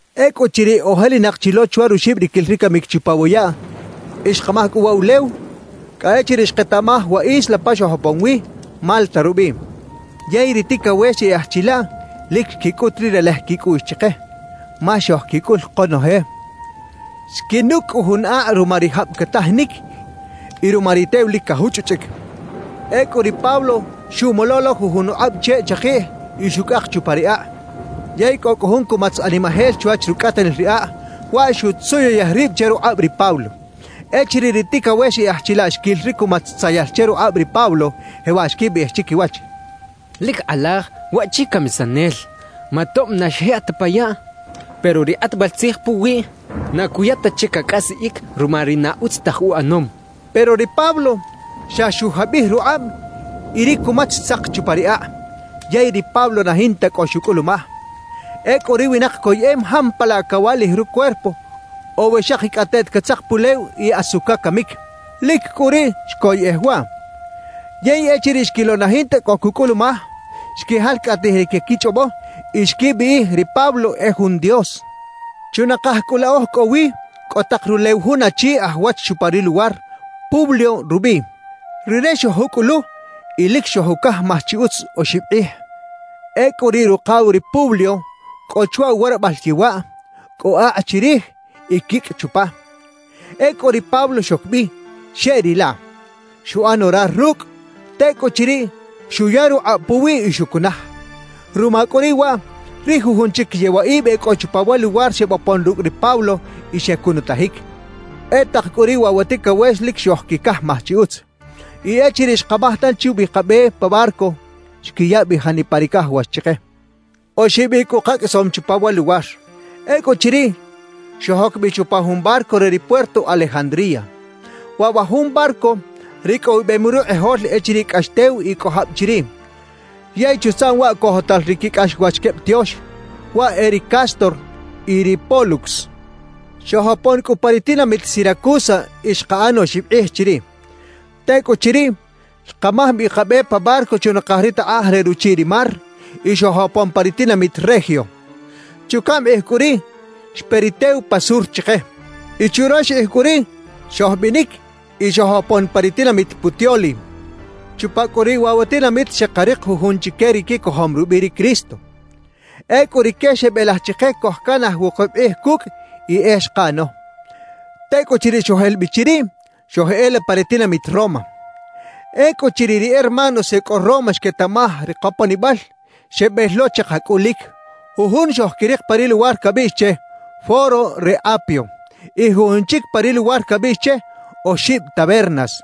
Ecꞌuchiriꞌ ojelinak chi lo chwa ruxibriquil ri camic chupa wa yaꞌ y xkamaj cꞌu uwa ulew, cꞌa echiriꞌ xketaꞌmaj wa isla pa xojopon wi, Malta rubiꞌ. Yey ri ticawex e aj chilaꞌ lic xquicꞌut ri relej quicꞌuꞌx chike, ma xojquicꞌul konoje. Xquinucꞌ cꞌu jun akꞌ ruma ri jab catajinic y ruma ri tew lic cajuchꞌuchꞌic. Ecꞌu ri Pablo xuꞌmolo lo jujun ukꞌab cheꞌ chakiꞌj y xucꞌak chupa ri akꞌ. Yey cꞌo cꞌu jun cumatz animajel chwach rucꞌatanil ri akꞌ; waꞌ xutzuyuyej rib che rukꞌab ri Pablo. Echiriꞌ ri ticawex e aj chilaꞌ xquil ri cumatz tzayal che rukꞌab ri Pablo, jewaꞌ xquibiꞌij chiquiwach: «Lic kꞌalaj waꞌchi camisanel; ma tob na xjikꞌ ta pa yaꞌ, pero ri kꞌatbal tzij puwiꞌ na cuya ta che cacꞌasiꞌic ruma ri na utz taj uꞌanom» xechaꞌ. Pero ri Pablo xa xujabij rukꞌab y ri cumatz xtzak chupa ri akꞌ, yey ri Pablo na jinta cꞌo xucꞌulumaj. Ecꞌu ri winak coyeꞌem jampalaꞌ cawaꞌlij rucuerpo o we xakicꞌateꞌt catzak pulew y asu cacamic. Lic cꞌu riꞌ xcoyꞌej waꞌ. Yey echiriꞌ xquilo na jinta cꞌo cucꞌulumaj, xquijalcꞌatij ri caquichꞌobo y xquibiꞌij ri Pablo e jun dios. Chunakaj cꞌu la oj cꞌo wi cꞌo tak rulew jun achi aj wach chupa ri luwar, Publio rubiꞌ. Rire xojucꞌulu y lic xojucajmaj chi utz oxib kꞌij. Ecꞌu riꞌ rukaw ri Publio cꞌo chwa uwarabal yewaꞌ; cꞌo akꞌ chirij y quicꞌ chupa. Ecꞌu ri Pablo xoc bi, xeꞌrilaꞌ. Xuꞌan orar rucꞌ; tecꞌuchiriꞌ, xuya rukꞌab puwiꞌ y xucunaj. Ruma cꞌu riꞌ waꞌ, ri jujun chic yewaꞌib e cꞌo chupa wa luwar xebopon rucꞌ ri Pablo y xecunutajic. E tak cꞌu riꞌ waꞌ wa ticawex lic xojquicajmaj chi utz. Y echiriꞌ xkamaj tanchi ubi kabe pa barco, xquiya bi janipa ri cajawax chike. Oxib icꞌ cꞌu kaqꞌuisom chupa wa luwar. Ecꞌuchiriꞌ, xojoc bi chupa jun barco re ri puerto Alejandría. Waꞌ wa jun barco ricꞌowibem rukꞌijol echiriꞌ cꞌax tew y cꞌo jab chiriꞌ; yey chutzaꞌm waꞌ cojotal ri quicꞌaxwach queb tiox, waꞌ e ri Cástor y ri Pólux. Xojopon cꞌu pa ri tinamit Siracusa y xkaꞌan oxib kꞌij chiriꞌ. Tecꞌuchiriꞌ, xkamaj bi kabe pa barco chunakaj ri takꞌaj re ruchiꞌ ri mar y xojopon pa ri tinamit Regio. Chucaꞌm kꞌij cꞌu riꞌ, xpe ri tew pa sur chike. Y churox kꞌij cꞌu riꞌ xojbinic y xojopon pa ri tinamit Puteoli. Chupa cꞌu riꞌ wa tinamit xekarik jujun chique ri quicojom rubiꞌ ri Cristo. Ecꞌu rique xebelaj chike cojcanaj wukub kꞌij cucꞌ, y e xkaꞌano. Tecꞌuchiriꞌ xojel bi chiriꞌ, xojeꞌela pa ri tinamit Roma. Ecꞌuchiriꞌ ri hermanos e cꞌo Roma xquetaꞌmaj ri koponibal, xebel lo che kacꞌulic. Jujun xojquirik pa ri luwar cabiꞌx che: “Foro re Apio”, y jujun chic pa ri luwar cabiꞌx che “Oxib Tabernas”.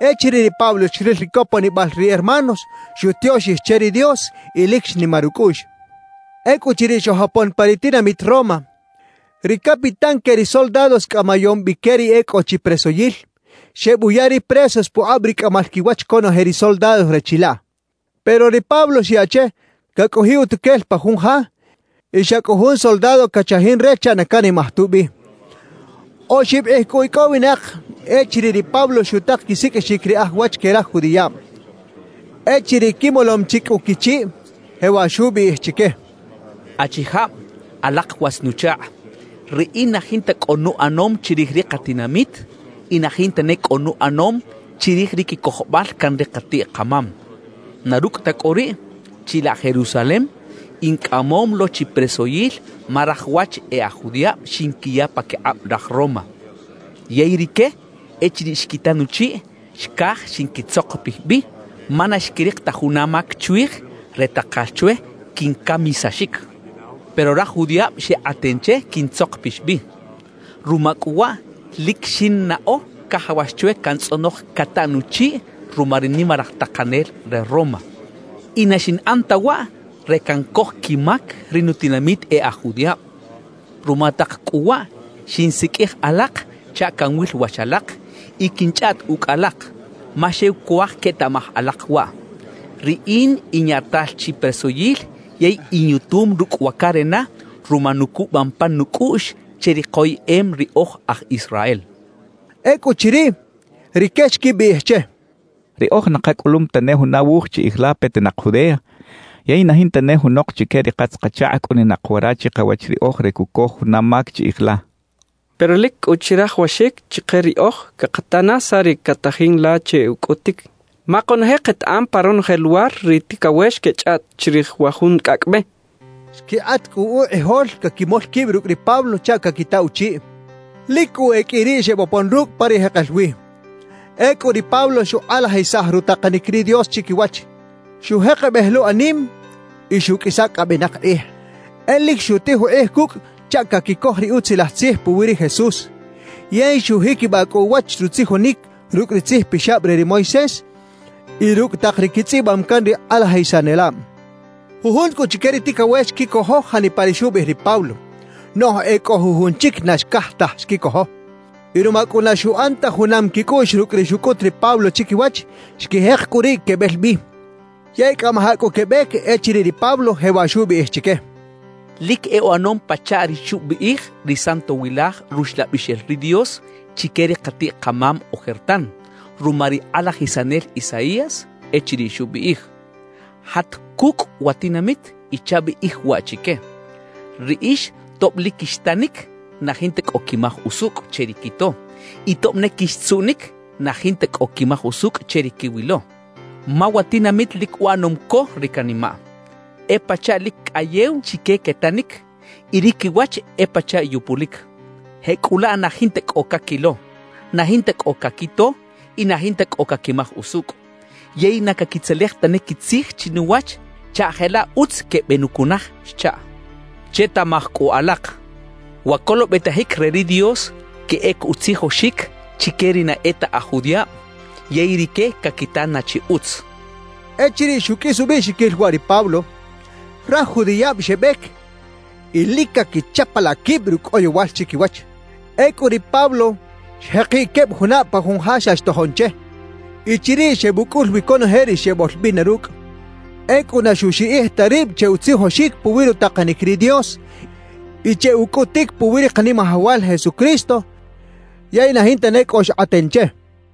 Echiriꞌ ri Pablo xril ri coponibal ri hermanos, xutioxij che ri Dios y lic xnimar ucꞌuꞌx. Ecꞌuchiriꞌ xojopon pa ri tinamit Roma, ri capitán que ri soldados cꞌamayom bi que ri e cꞌo chi presoyil, xebuya ri presos pukꞌab ri cꞌamal quiwach conoje ri soldados re chilaꞌ. Pero ri Pablo xyaꞌ che cacꞌojiꞌ utuquel pa jun ja y xa cꞌu jun soldado cachajin re chaꞌ na canimaj tubi. Oxib kꞌij cꞌu icꞌowinak echiriꞌ ri Pablo xutak quisiqꞌuixic ri aj wach que raj judiꞌab. Echiriꞌ quimolom chi cꞌu quichiꞌ, jewaꞌ xubiꞌij chique: —Achijab, alak watz-nuchakꞌ, riꞌin na jinta cꞌo nuꞌanom chirij ri katinamit y na jinta ne cꞌo nuꞌanom chirij ri quicojobal can ri katiꞌ-kamam. Na rucꞌ ta cꞌu riꞌ, chilaꞌ Jerusalem in cꞌamom lo chi presoyil ma raj wach e aj judiꞌab xinquiya paquikꞌab raj Roma. Yey rique echiriꞌ xquita nuchiꞌ, xcaj xinquitzokopij bi, ma na xquirik ta juna mac chwij re takal chwe quincamisaxic. »Pero raj judiꞌab xekꞌaten che quintzokpix bi. Ruma cꞌu waꞌ, lic xinnaꞌo cajawax chwe cantzꞌonoj cataꞌ nuchiꞌ ruma ri nimalaj takanel re Roma. Y na xinꞌan ta waꞌ re cancoj quimac ri nutinamit e aj judiꞌab. Ruma tak cꞌu waꞌ, xinsiqꞌuij alak chaꞌ canwil wach alak y quinchꞌaꞌt ucꞌ alak, ma xew cuaj quetaꞌmaj alak waꞌ: Riꞌin in yaꞌtal chi presoyil yey inyutum rucꞌ wa carena ruma nucubam pan nucꞌuꞌx che ri koyeꞌem ri oj aj Israel —xcha chique. Ecꞌuchiriꞌ, rique xquibiꞌij che: —Riꞌoj na kacꞌulum tane juna wuj chiꞌij la petinak Judea; yey na jinta ne junok chique ri katz-kachakꞌ cꞌuninak wara chikawach riꞌoj re cucoj juna mac chiꞌij la. Pero lic cꞌu chirajawaxic chike riꞌoj cakata na saꞌ ri catajin la che ucꞌutic; ma konoje ketaꞌam pa ronoje luwar ri ticawex quechꞌaꞌt chirij wa jun Cꞌacꞌ Be —xechaꞌ. Xquikꞌat cꞌu ukꞌijol caquimol quib rucꞌ ri Pablo chaꞌ caquita uchiꞌ. Lic cꞌu e qꞌui riꞌ xebopon rucꞌ pa ri jekel wi. Ecꞌu ri Pablo xukꞌalajisaj rutakanic ri Dios chiquiwach; xujekebej lo anim y xuꞌqꞌuisa cꞌa benak kꞌij. E lic xutij ukꞌij cucꞌ chaꞌ caquicoj ri Utzilaj Tzij puwi ri Jesús. Yey xujiquibaꞌ cꞌu uwach rutzijonic rucꞌ ri Tzij Pixab re ri Moisés y rucꞌ tak ri quitzꞌibam can ri kꞌalajisanelab. Jujun cꞌu chique ri ticawex xquicojo janipa ri xubiꞌij ri Pablo, noꞌj e cꞌo jujun chic na xcaj taj xquicojo. Y ruma cꞌu na xuꞌan ta junam quicꞌuꞌx rucꞌ ri xucꞌut ri Pablo chiquiwach, xquijek cꞌu riꞌ quebel bi. Yey cꞌamajaꞌ cꞌu quebec echiriꞌ ri Pablo jewaꞌ xubiꞌij chique: «Lic e uꞌanom pachaꞌ ri xubiꞌij ri Santowilaj Ruxlabixel ri Dios chique ri katiꞌ-kamam ojertan ruma ri kꞌalajisanel Isaías echiriꞌ xubiꞌij: Jat cucꞌ wa tinamit y chabiꞌij waꞌ chique: “Riꞌix tob lic quixtanic, na jinta cꞌo quimaj usucꞌ che ri quito; y tob ne quixtzuꞌnic, na jinta cꞌo quimaj usucꞌ che ri quiwilo.” Ma wa tinamit lic uꞌanom co ri canimaꞌ; e pachaꞌ lic cꞌayew chique quetanic, y ri quiwach e pachaꞌ yupulic. Jecꞌulaꞌ na jinta cꞌo caquilo, na jinta cꞌo caquito y na jinta cꞌo caquimaj usucꞌ; yey na caquitzelej tane quitzij chinuwach chaꞌ jelaꞌ utz quebenucunaj xchaꞌ. »Chetaꞌmaj cꞌu alak: Wa colobetajic re ri Dios queꞌec utzijoxic chique ri na e ta aj judiꞌab, yey rique caquita na chi utz» xchaꞌ. Echiriꞌ xuqꞌuis ubiꞌxiquil waꞌ ri Pablo, raj judiꞌab xebec y lic caquichapalaꞌ quib rucꞌ oyowal chiquiwach. Ecꞌu ri Pablo xjekiꞌ queb junab pa jun ja xa xtojon che. Y chiriꞌ xebucꞌul wi conoje ri xeboꞌlbina rucꞌ. Ecꞌu na xuxiꞌij ta rib che utzijoxic puwi rutakanic ri Dios y che ucꞌutic puwi ri Kanimajawal Jesucristo; yey na jinta ne cꞌo xkꞌaten che.